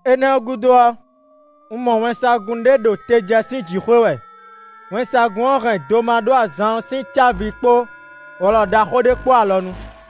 Énɛ́ ɔ́ gúdo ɔ́, un mɔ wɛnsagun ɖé ɖo te jɛ sín jǐxwé wɛ; wɛnsagun ɔ́ hɛn domaɖó-azan ɔ́ sín cávi kpó wlɔ ɖaxó ɖé kpó alɔnu.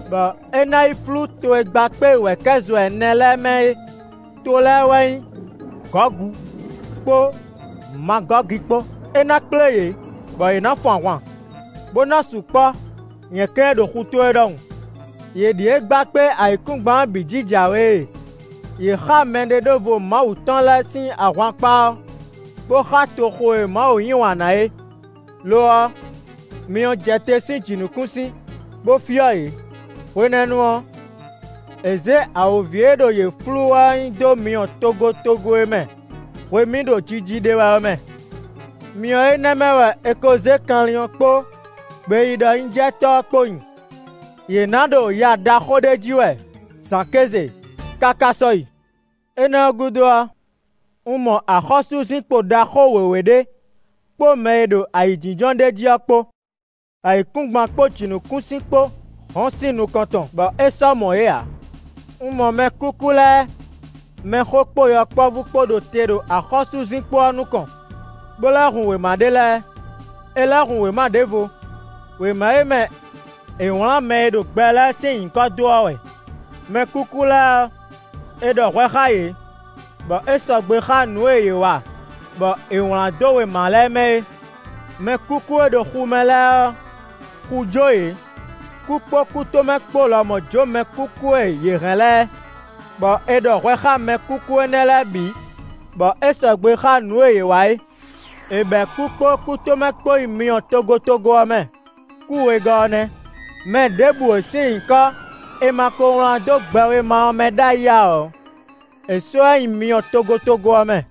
bɔ é ná yi flú to e gba kpé wɛ̌kɛ́zo ɛnɛ lɛ́ɛ mɛ é; to lɛ́ɛ wɛ nyí Gɔgu kpó Magɔ́gi kpó. É ná kplé yě, bɔ yě ná fun ahwan, bó ná sukpɔ́ nyɛ̌kɛ́n e ɖo xutó é ɖɔhun. Yě ɖíe gba kpé ayǐkúngban ɔ́ bǐ jí jǎwe e; yě xá mɛɖeɖóvo Mawu tɔn lɛ́ɛ sín ahwankpá ɔ́ bó xá toxo e Mawu yí wǎn ná é. Lo ɔ́ myɔ jɛ te sín jǐnukúnsin bó fyɔ́ yě. Hwenɛ́nu ɔ́, è zě awǒvi e ɖo yě flú wɛ ɔ́ nyi dó myɔ togotogo e mɛ hwemí ɖo jiji ɖe wɛ ɔ́ mɛ; myɔ énɛ́ mɛ wɛ è ko zé kanlin ɔ́ kpó gbeyíɖɔnyíjɛtɔ́ ɔ́ kpó nyi; yě ná ɖo ya ɖaxó ɖé ji wɛ zǎn kéze káká sɔ́yi. Énɛ́ ɔ́ gúdo ɔ́, un mɔ axɔ́súzinkpo ɖaxó wěwé ɖé kpó mɛ e ɖo ayǐjínjɔ́n ɖ'é jí ɔ́ kpó. Ayǐkúngban kpó jǐnukúnsin kpó hɔn sín nukɔn tɔn, bɔ é sɔ́ mɔ yě ǎ. Un mɔ mɛkúkú lɛ́ɛ, mɛxó kpó yɔkpɔ́vú kpó ɖo te ɖo axɔ́súzinkpo ɔ́ nukɔn, bó lɛ́ hun wěma ɖé lɛ́ɛ. È lɛ̌ hun wěma ɖěvo; wěma e mɛ è wlǎn mɛ e ɖo gbɛ lɛ́ɛ sín nyǐkɔ dó ɔ́ wɛ. Mɛkúkú lɛ́ɛ ɔ́, è ɖɔ hwɛ xá yě bɔ é sɔgbe xá nǔ e yě wa bɔ è wlǎn dó wěma lɛ́ɛ mɛ é. Mɛkúkú e ɖo xu mɛ lɛ́ɛ ɔ́, xu jó yě. Kú kpó kútomɛ kpó lɔmɔ̌ jó mɛkúkú e yě hɛn lɛ́ɛ, bɔ è ɖɔ hwɛ xá mɛkúkú énɛ́ lɛ́ɛ bǐ bɔ é sɔgbe xá nǔ e yě wa é. È bɛ̌ kú kpó kútomɛ kpó nyi myɔ togotogo ɔ́ mɛ; kú wegɔ́ ɔ́ nɛ́. Mɛ ɖěbǔ e sín nyǐkɔ è ma ko wlán dó gbɛwéma ɔ́ mɛ ɖ'ayǐ ǎ ɔ́, è sɔ́ ɛ nyi myɔ togotogo ɔ́ mɛ.